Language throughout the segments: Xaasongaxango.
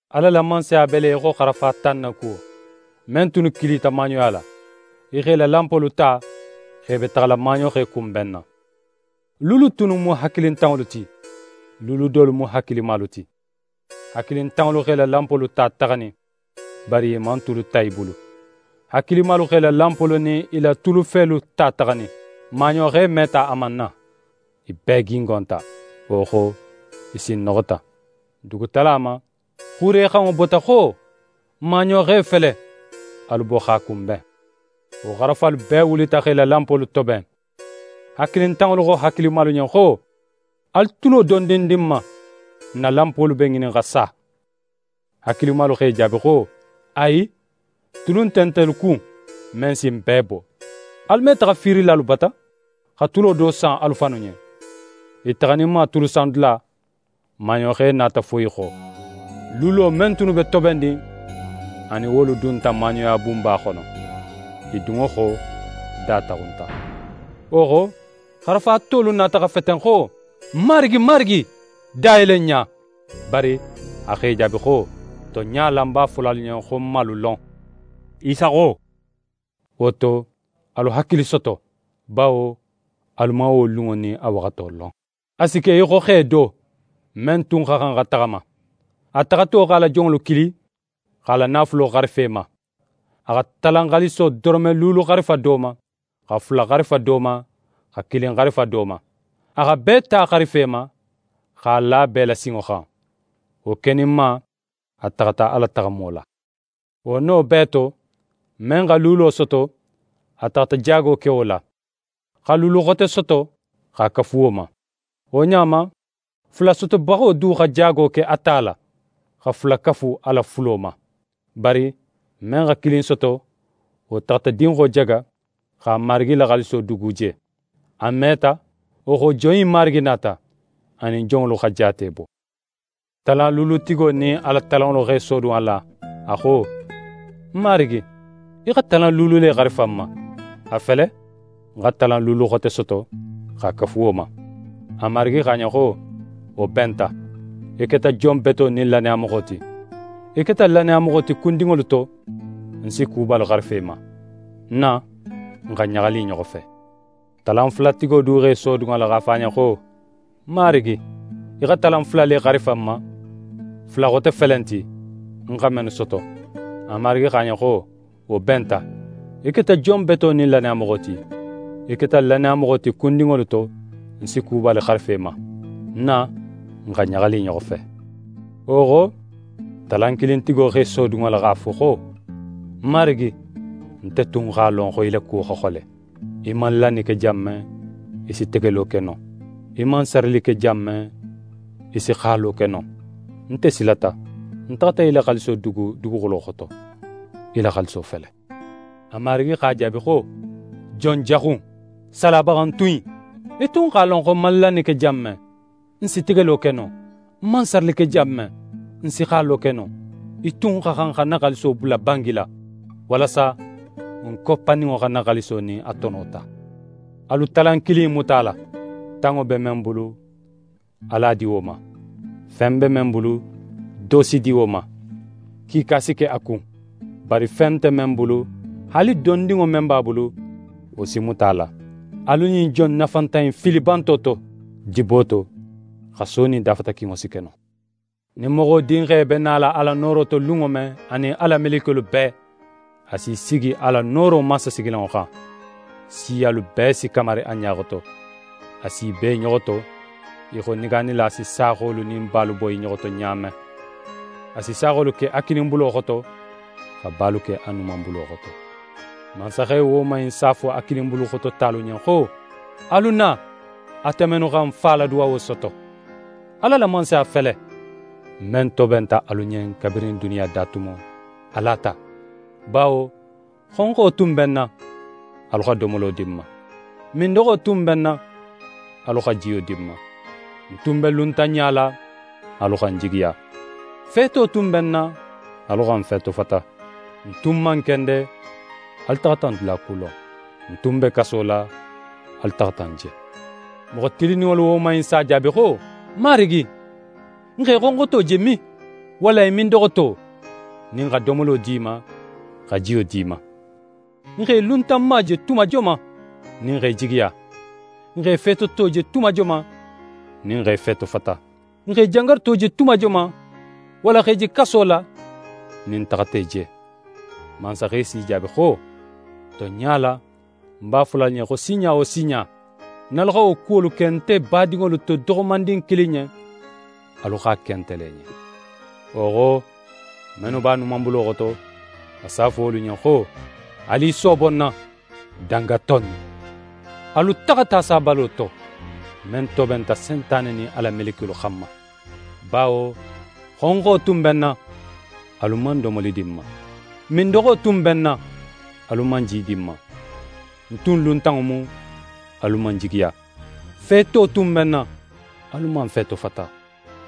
«Ala la Mansaya be le í xo xarafa tan na kuwo, men tunnu kilita maaɲoya la. I x'e la lanpolu ta, x'e be taxala maaɲoxe kunbenna. Luulu tunnu mu hakilintanŋolu ti, luulu dolu mu hakilimalu ti. Hakilintanŋolu x'e la lanpolu ta taxanin, bari i man tulu ta i bulu. Hakilimalu x'e la lanpolu nin i la tulufelu ta taxanin. Maaɲoxe meta a man na. I bee gingonta, wo xo i sinnoxota. «Dugutala ma, xuurexanŋo bota xo: “Maaɲoxe fele, alu bo x'a kunben.” Wo xarafalu bee wulita x'e la lanpolu toben. Hakilintanŋolu xo hakilimalu ɲen xo: “Alu tulo dondin di n ma, n na lanpolu be ŋinin xa sa.” Hakilimalu x'e jaabi xo: “Ayi, tulu nte ntelu kun, men si n bee bo. Alu me taxa fiirilalu bata, xa tulo do san alu fannu ɲen.” I taxaninma tulu san dula, maaɲoxe nata fo i xo. Luulo men tunnu be tobennin, a nin wolu dunta maaɲoya bunba xono. I dunŋo xo, da taxunta. Wo xo, xarafa tolu nata xa feten xo: “Marigi, marigi, da yele n ɲa!” Bari a x'e jaabi xo: “Tonɲa la, ń b'a fola alu ɲen xo ń man alu lon.” Isa xo: “Wo to, alu hakili soto, bawo alu man wo lunŋo nin a waxato lon”.» «A si ke í xo xe do, men tun xa xan xa taxama. A taxato x'a la jonŋolu kili, x'a la naafulo xarifa i ma. A xa talan xaaliso doronme luulu xarifa do ma, xa fula xarifa do ma, xa kilin xarifa do ma. A xa bee ta xarifa i ma, x'a la bee la sinŋo xan. Wo keninma, a taxata a la taxamo la. Wo no bee to, men xa luulo soto, a taxata jaago ke wo la, xa luulu xote soto x'a kafu wo ma. Wo ɲa ma, fula sotobaxo du xa jaago ke a ta la, xa fula kafu a la fulo ma. Bari men xa kilin soto, wo taxata dinxo jaga, x'a marigi la xaaliso dugu je. «A meta, wo xo, jon innu marigi nata. A nin jonŋolu xa jaate bo. Talanluulutigo nin a la talanŋolu x'é sodun a la, a xo: “Ń marigi, í xa talan luulu le xarifa ń ma; a fele ń xa talan luulu xote soto x'a kafu wo ma.” A marigi xo a ɲen xo: “Wo benta, í keta jon beto nin lannayamoxo ti. Í keta lannayamoxo ti kundinŋolu to, ń si kubalu xarifa í ma. Na, n xa ɲaxali i ɲoxo fe.” Talanfulatigo du x'é sodun a la x'a fo a ɲen xo: “Ń marigi, í xa talan fula le xarifa ń ma; fula xote felenti, ń xa mennu soto.” A marigi xo a ɲen xo: “Wo benta, í keta jon beto nin lannayamoxo ti. Í keta lannayamoxo ti kundinŋolu to, ń si kubalu xarifa í ma. Na, n xa ɲaxali i ɲoxo fe.” Wo xo, talankilintigo x'é sodun a la x'a fo xo: “Ń marigi, nte tun x'a lon xo í la kuwo xa xole. Í man lanni ke jan men, í si tegelo ke non. Í man sarili ke jan men, í si xalo ke non. Nte silata, ń taxata í la xaaliso dugu duguxulo xoto. Í la xaaliso fele.” A marigi x'a jaabi xo: “Jon jaxu in, salabaxantun in! Í tun x'a lon xo ń man lanni ke jan men, ń si tegelo ke non, ń man sarili ke jan men, ń si xalo ke non. Í tun xa xan xa ń na xaaliso bula bangi la, walasa ń koppaninŋo xa ń na xaaliso nin a tono ta. Alu talan kilin in muta a la. Tanŋo be men bulu, alu a di wo ma.” Fen be men bulu, do si di wo ma, kiika si ke a kun; bari fen nte men bulu, haali dondinŋo men b'a bulu, wo si muta a la. Alu ɲin jon nafantan in fili banto to, dibo to. Xaso nin dafatakinŋo si ke non.» «Nin Moxo Dinxe be nala a la nooro xono lunŋo men, anin a la melekiyolu bee, a s'í sigi a la nooro mansasigilanŋo xan. Siyalu bee si kamari a ɲa xoto. A s'i bo i ɲoxo to í xo negaanila si saaxolu nin balu bo i ɲoxo to ɲa men. A si saaxolu ke a kininbulo xoto, xa balu ke a numanbulo xoto. Mansaxe woman in si a fo a kininbulu xoto talu ɲen xo: “Alu na, ate mennu xa ń Fa la duwawo soto. Ala la Mansaya fele, men tobenta alu ɲen kabirin duniya da tumo, alu a ta. Bawo xonxo tun be ń na, alu xa domolo di ń ma; mindoxo tun be ń na, alu xa jiyo di ń ma. Ń tun be luntanɲa la, alu xa ń jigiya. Feeto tun be ń na, alu xa ń feetofata. Ń tun man kende, alu taxata ń dulakulon. Ń tun be kaso la, alu taxata ń je. Moxo tilinninŋolu woman innu si a jaabi xo: “Marigi, n x'é xonxoto je min, walla í mindoxoto, nin n xa domolo di í ma, xa jiyo di í ma? N x'é luntanma je tuma joman nin n x'é jigiya? N x'é feetoto je tuma joman nin n x'é feetofata? N x'é jangaruto je tuma joman, walla x'é je kaso la nin n taxata í je?” Mansaxe s'i jaabi xo: “Tonɲa la, ń b'a fola alu ɲen xo sinɲa wo sinɲa, nin alu xa wo kuwolu ke nte badinŋolu to doxomandin kilin ɲen, alu x'a ke nte le ɲen.” «Wo xo, mennu b'a numanbulo xoto, a si a fo wolu ɲen xo: “Alu i soobo ń na, dangato innu. Alu taxa ta sabalo to, men tobenta Sentane nin a la melekiyolu xanma. Bawo xonxo tun be ń na, alu man domoli di ń ma; mindoxo tun be ń na, alu man ji di ń ma. Ń tun luntanŋo mu, alu man ń jigiya. Feeto tun be ń na, alu man ń feetofata.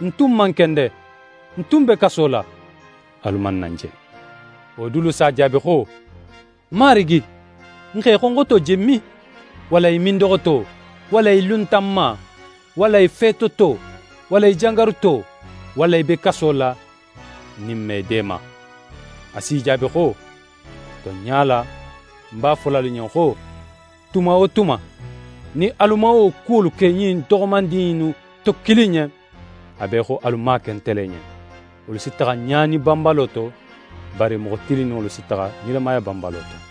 Ń tun man kende, ń tun be kaso la, alu man na ń je.” Wo dulu si a jaabi xo: “Marigi, n x'é xonxoto je min, walla í mindoxoto, walla í luntanma, walla í feetoto, walla í jangaruto, walla í be kaso la, nin n man í deema?” A s'i jaabi xo: “Tonɲa la, ń b'a fola alu ɲen xo, tuma wo tuma, nin alu man wo kuwolu ke ɲin doxomandin innu to kilin ɲen, a be í xo alu man a ke nte le ɲen.” Wolu si taxa ɲaani banbalo to, bari moxo tilinninŋolu si taxa nilamaya banbalo to.»